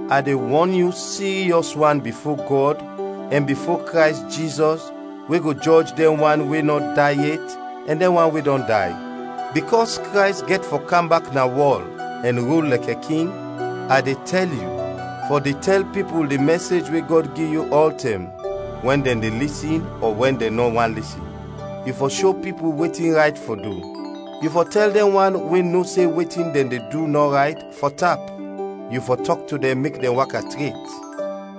A de wɔn yu siryɔs wan bifo Gɔd ɛn bifo Krays Jizɔs we go jɔj dɛn wan we nɔ day yet ɛn dɛn wan we dɔn day: bikɔs Krays gɛt fɔ kam bak na wɔl ɛn rul lɛkɛ King, a de tɛl yu, fɔ de tɛl pipul di mɛsej we Gɔd gi yu ɔltɛm, wɛn dɛn de lisin ɔ wɛn dɛn nɔ want lisin; yu fɔ sho pipul wetin rayt fɔ du; yu fɔ tɛl dɛn wan we no se wetin dɛn de du nɔ rayt, fɔ tap; yu fɔ tɔk to dɛn mek dɛn waka tret;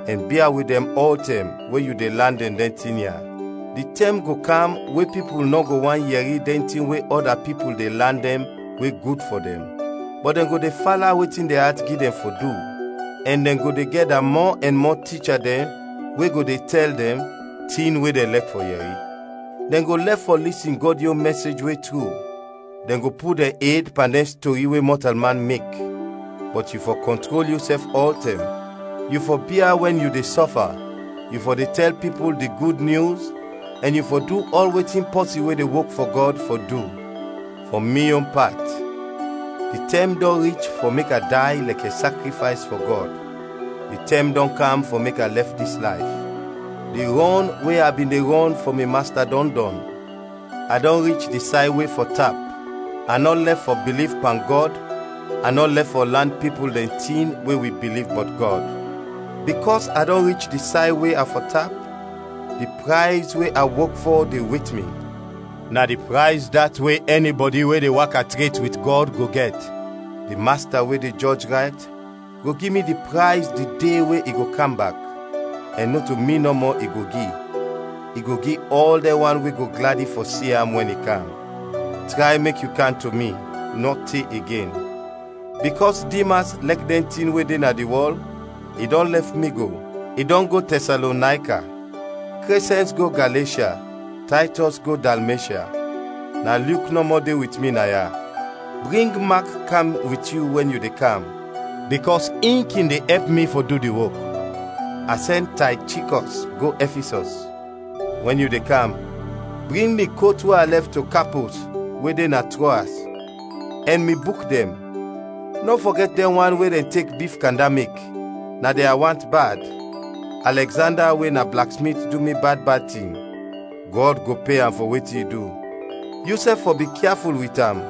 ɛn bia wit dɛn ɔltɛm wɛn yu de lan dɛn dɛn tin ya. Di tɛm go kam we pipul nɔ go want yɛri dɛn tin we ɔda pipul de lan dɛn we gud fɔ dɛn, bɔt dɛn go de fala wetin dɛn at gi dɛn fɔ du, ɛn dɛn go de gɛda mɔ ɛn mɔ ticha dɛn we go de tɛl dɛn tin we dɛn lɛk fɔ yɛri. Dɛn go lɛf fɔ lisin Gɔd yon mɛsej we tru, dɛn go put dɛn ed pan dɛn stori we mɔtalman mek. Bɔt yu fɔ kɔntrol yusɛf ɔltɛm; yu fɔ bia wɛn yu de sɔfa, yu fɔ de tɛl pipul di Gud Nyus, ɛn yu fɔ du ɔl wetin pɔsin we de wok fɔ Gɔd fɔ du. Fɔ mi yon pat, di tɛm dɔn rich fɔ mek a day lɛkɛ sakrifays fɔ Gɔd; di tɛm dɔn kam fɔ mek a lɛf dis layf. Di rɔn we a bin de rɔn fɔ mi Masta dɔn dɔn, a dɔn rich di say we fɔ tap, a nɔ lɛf fɔ biliv pan Gɔd, a nɔ lɛf fɔ lan pipul dɛn tin we wi biliv bɔt Gɔd. Bikɔs a dɔn rich di say we a fɔ tap, di prayz we a wok fɔ de wet mi, na di prayz dat we ɛnibɔdi we de waka tret wit Gɔd go gɛt, di Masta we de jɔj rayt go gi mi di prayz di de we i go kam bak; ɛn nɔto mi nɔmɔ i go gi, i go gi ɔl dɛn wan we go gladi fɔ si am wɛn i kam. Tray mek yu kam to mi, nɔ te igen. Bikɔs Dimas lɛk dɛn tin we de na di wɔl, i dɔn lɛf mi go; i dɔn go Tɛsalonayka. Krɛsɛns go Galeshya, Taytɔs go Dalmeshya. Na Lyuk nɔmɔ de wit mi naya. Bring Mak kam wit yu wɛn yu de kam, bikɔs in kin de ɛp mi fɔ du di wok. A sɛn Taychikɔs go Ɛfisɔs. Wɛn yu de kam, bring mi kot we a lɛf to Kapos we de na Troas, ɛn mi buk dɛn, nɔ fɔgɛt dɛn wan we dɛn tek bif kanda mek, na dɛn a want bad. Alɛgzanda we na blaksmit du mi bad bad tin. Gɔd go pe am fɔ wetin i du. Yusɛf fɔ bikyaful wit am,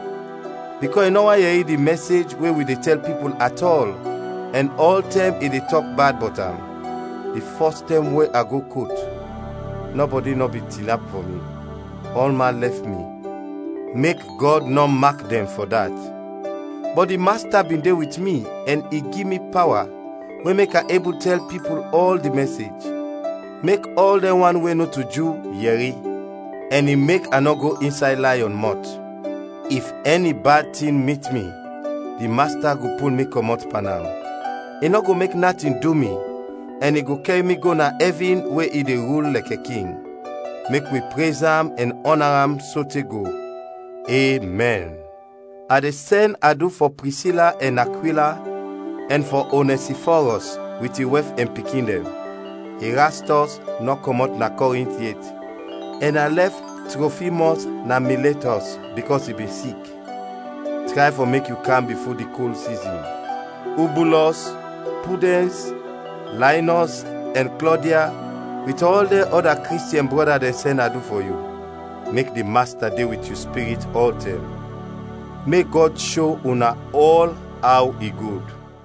bikɔs i nɔ want yɛri di mɛsej we wi de tɛl pipul at ɔl, ɛn ɔltɛm i de tɔk bad bɔt am. Di fɔs tɛm we a go kot, nɔbɔdi nɔ bin tinap fɔ mi; ɔlman lɛf mi. Mek Gɔd nɔ mak dɛn fɔ dat! Bɔt di Masta bin de wit mi ɛn i gi mi pawa, we mek a ebul tɛl pipul ɔl di mɛsej, mek ɔl dɛn wan we nɔto Ju, yɛri; ɛn i mek a nɔ go insay layɔn mɔt. If ɛni bad tin mit mi di Masta go pul mi kɔmɔt pan am, i nɔ go mek natin du mi ɛn i go kɛr mi go na ɛvin we i de rul lɛkɛ King. Mek wi prez am ɛn ɔna am sote go! Emɛn. A de sɛn adu fɔ Prisila ɛn Akwila ɛn fɔ Onɛsifɔrɔs wit in wɛf ɛn pikin dɛn. Irastɔs nɔ kɔmɔt na Kɔrint yet, ɛn a lɛf Trɔfimɔs na Miletɔs, bikɔs i bin sik. Tray fɔ mek yu kam bifo di kol sizin. Ubulɔs, Pudɛns, Laynɔs ɛn Klɔdia, wit ɔl dɛn ɔda Kristiɛn brɔda dɛn sɛn adu fɔ yu. Mek di Masta de wit yu spirit ɔltɛm. Mek Gɔd sho una ɔl aw i gud.